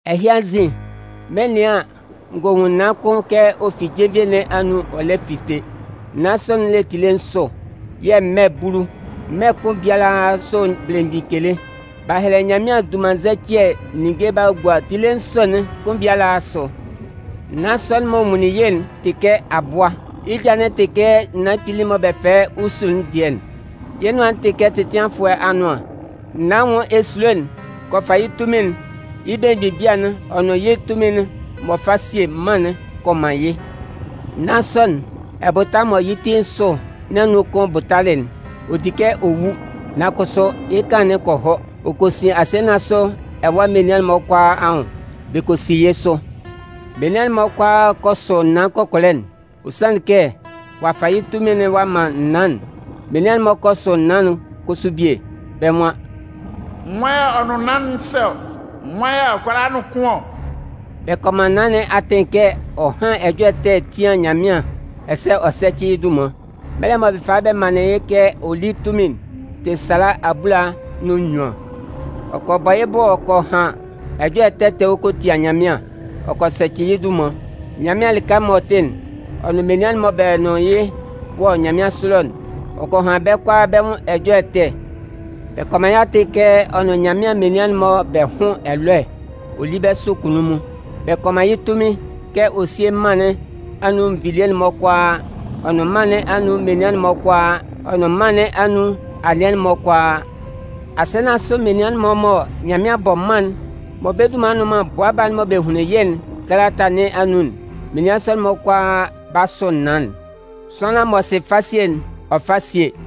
Ɛhɩ anzin, mɩn 'nɩan an, n gɔ nwun naan kʋn kɛ ɔ fi jenvie nɩn anun ɔ lɛ fite. Naan sɔ'n le tile nsʋ, yɛ̂ mmɛ bulu. Mmɛ kʋn biala sʋ belemgbin kele. B'a hɛlɛ Nyanmɩan dunmannzɛcɩɛ ninnge b'a gua tile nsʋ'n kʋn biala asʋ. Naan sɔ'n mɔ n nwunlin yɩ́'n tɩ kɛ abʋa. Yɩ́ ja'n tɩ kɛ naan kpili'n mɔ bɛ fɛlɛ yɩ́ usu'n dɩɛ'n. Yɩ́ nʋan'n tɩ kɛ tɛtɩanfʋɛ anʋan. Naan anwʋn esulo'n kɔ fa yɩ́ tunmin'n, yɩ́ belemgbin bia'n ɔ nʋn yɩ́ tunmin'n m'ɔ fa sie mân'n kɔ man yɩ́. Naan sɔ'n, ɛbʋta mɔ yɩ́ ti nsʋ nɩn anun kʋn bʋtalɩ'n, ɔ di kɛ ɔ wu. Nan kʋsʋ yɩ́ kanlan'n kɔ hɔ. Ɔ kɔ sin asɩɛ nɩn asʋ ɛwa menian'n-mɔ kʋalaa anwʋn, bɛ kɔ si yɩ́ sʋ. Menian'n-mɔ kʋalaa kɔ sʋ naan kɔkɔlɛ'n. Ɔ sanlɩn kɛ ɔ'a fa yɩ́ tunmin'n ɔ'a man naan'n. Menian'n-mɔ kɔ sʋ naan'n kʋsʋ bie. Bɛ́ nwan: “Nwan yɛ̂ ɔ nʋn naan'n sɛ ɔ? Nwan yɛ̂ ɔ kʋala yɩ́ nʋn kʋn ɔ?” Bɛ kɔ man naan nɩn atɩn kɛ ɔ hán ɛjɔlɛ ɛtɛ tía Nyanmɩan ɛsɛ ɔ sɛ́cɩ yɩ́ dunman. Mɛlɛ'n mɔ bɛ falɩ bɛ manlɩn yɩ́ kɛ ɔ lí tunmin'n tɩ sala abulanan nʋn nnyuan. Ɔ kɔ bɔ yɩ́ bʋ ɔ kɔ han ɛjɔlɛ ɛtɛ ɛtɛ ɔ kɔ tia Nyanmɩan, ɔ kɔ sɛcɩ yɩ́ dunman. Nyanmɩan lɩka m'ɔ tɩ'n, ɔ nʋn menian mɔ bɛ nʋn yɩ́ wɔ nyanmɩansʋ ɛlɔ'n, ɔ kɔ han bɛ́ kʋalaa bɛ́ nwʋn ɛjɔlɛ ɛtɛ. Bɛ kɔ man yɩ́ atɩn kɛ ɔ nʋn Nyanmɩan menian'n-mɔ hʋ́n ɛlɔɛ ɔ lí bɛ́ sʋ kunnunmun. Bɛ kɔ man yɩ́ tunmin kɛ ɔ síe mân nɩn anun nvilie'n-mɔ kʋalaa, ɔ nʋn mân nɩn anun menian'n-mɔ kʋalaa, ɔ nʋn mân nɩn anun anɩɛ'n-mɔ kʋalaa. Asɩɛ nɩn asʋ menian'n-mɔ mɔ Nyanmɩan 'bɔ mân'n mɔ bɛ́ dunman nnʋn man Bʋa Baa'n mɔ bɛ hunlin yɩ́'n kalata nɩn anun'n, menian sɔ'n-mɔ kʋalaa 'ba sʋ naan'n. Sʋanlan m'ɔ sɩ fasie'n, ɔ fá síe.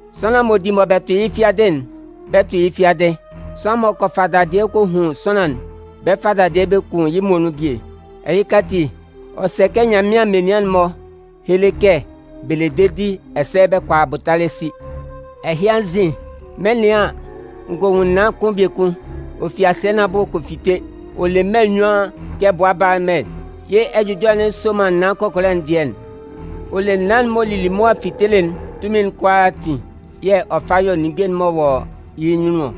Sʋanlan m'ɔ di mɔ bɛ tʋ yɩ́ fiadɩ'n, bɛ 'tʋ yɩ́ fiadɩ. Sʋanlan m'ɔ kɔ fa dadɩɛ kɔ hun sʋanlan'n, bɛ 'fa dadɩɛ bɛ kun yɩ́ muonun bie. Ɛhɩka ati, ɔ sɛ kɛ Nyanmɩan menian'n-mɔ héle kɛ bɛ le dedi ɛsɛ bɛ kʋala abʋtalɛ si. Ɛhɩ anzin, mɩn 'nɩan an, n gɔ nwun naan kʋn biekun. Ɔ fi asɩɛ nɩn abʋ ɔ kɔ fite. Ɔ le mmɛ nnyuan kɛ bʋa baa mmɛ. Yɩ́ ɛjʋjɔlɛ'n soman naan kɔkɔlɛ'n dɩɛ'n. Ɔ le naan'n m'ɔ lili mʋa fitelɩ'n tunmin'n kʋalaatin yɛ̂ ɔ fa yɔ ninnge'n-mɔ wɔ yɩ́ nyunnun ɔ.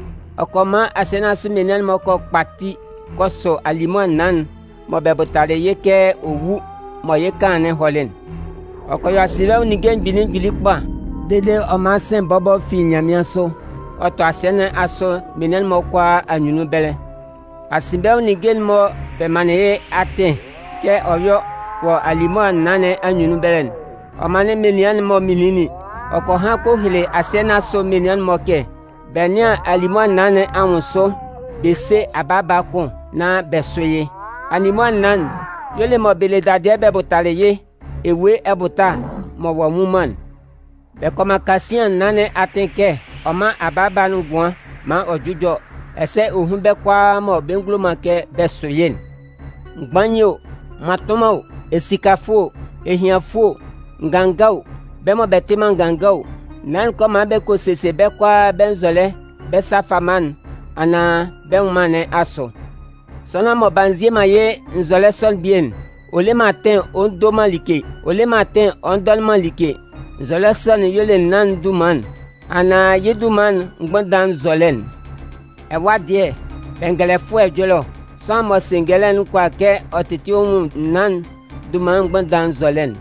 Ɔ kɔ man asɩɛ nɩn asʋ menian'n-mɔ kɔ kpati kɔ sʋ alimʋa naan'n mɔ bɛ bʋtalɩ yɩ́ kɛ ɔ 'wu mɔ yɩ́ kanlan'n hɔlɩ'n. Ɔ kɔ yɔ asinbɛnwʋn ninnge mgbili mgbili kpa, dede ɔ man sɩ̂n bɔbɔ fi nyanmɩansʋ ɔ tɔ asɩɛ nɩn asʋ menian'n-mɔ kʋalaa anyunnun ɛbɛlɛ. Asinbɛnwʋn ninnge'n mɔ bɛ manlɩn yɩ́ atɩn kɛ ɔ yɔ́ wɔ alimʋa naan nɩn anyunnun ɛbɛlɛ'n, ɔ manlɩn menian'n-mɔ minlinlin. Ɔ kɔ han kɔ hele asɩɛ nɩn asʋ menian'n-mɔ kɛ bɛ nɩ́an alimʋa naan nɩn anwʋn sʋ bɛ sé abaaba kʋn nán bɛ sʋ́ yɩ́. Alimʋa naan'n y'ɔ le mɔ bɛ le dadɩɛ bɛ bʋtalɩ yɩ́ ewue ɛbʋta mɔ ɔ'a nwu man'n. Bɛ kɔ man kasian naan nɩn atɩn kɛ ɔ mán abaaba'n ngʋan maan ɔ jʋ́jɔ ɛsɛ ɔ hún bɛ́ kʋalaa mɔ bɛ ngulo man kɛ bɛ sʋ yɩ́'n. Mgbain o, mmatʋnman o, esikafʋɛ o, ehianfʋɛ o, nganga o, bɛ́ mɔ bɛ tɩ man nganga o, naan'n kɔ man bɛ kɔ sesie bɛ́ kʋalaa bɛ́ nzɔlɛ bɛ́ sa fama'n anaan bɛ́ nwʋnnaan nɩn asʋ. Sʋanlan mɔ b'a nzie man yɩ́ nzɔlɛ sɔ'n bie'n, ɔ le man atɩn ɔ ndo man like, ɔ le man atɩn ɔ ndɔnɩn man like. Nzɔlɛ sɔ'n y'ɔ le naan'n dunman'n anaan yɩ́ dunman'n mgbʋnndan nzɔlɛ'n. Ɛwa dɩɛ, bɛngɛlɛfʋɛ ɛjɔlɛ ɔ. Sʋanlan m'ɔ sɩ ngɛlɛ'n kʋala kɛ ɔ tɩtɩ ɔ nwun naan'n dunman'n mgbʋnndan nzɔlɛ'n.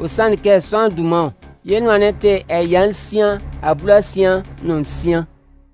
Ɔ sanlɩn kɛ sʋanlan dunman ɔ. Yɩ́ nʋan tɩ ɛya nsian abulasian nʋn nsian.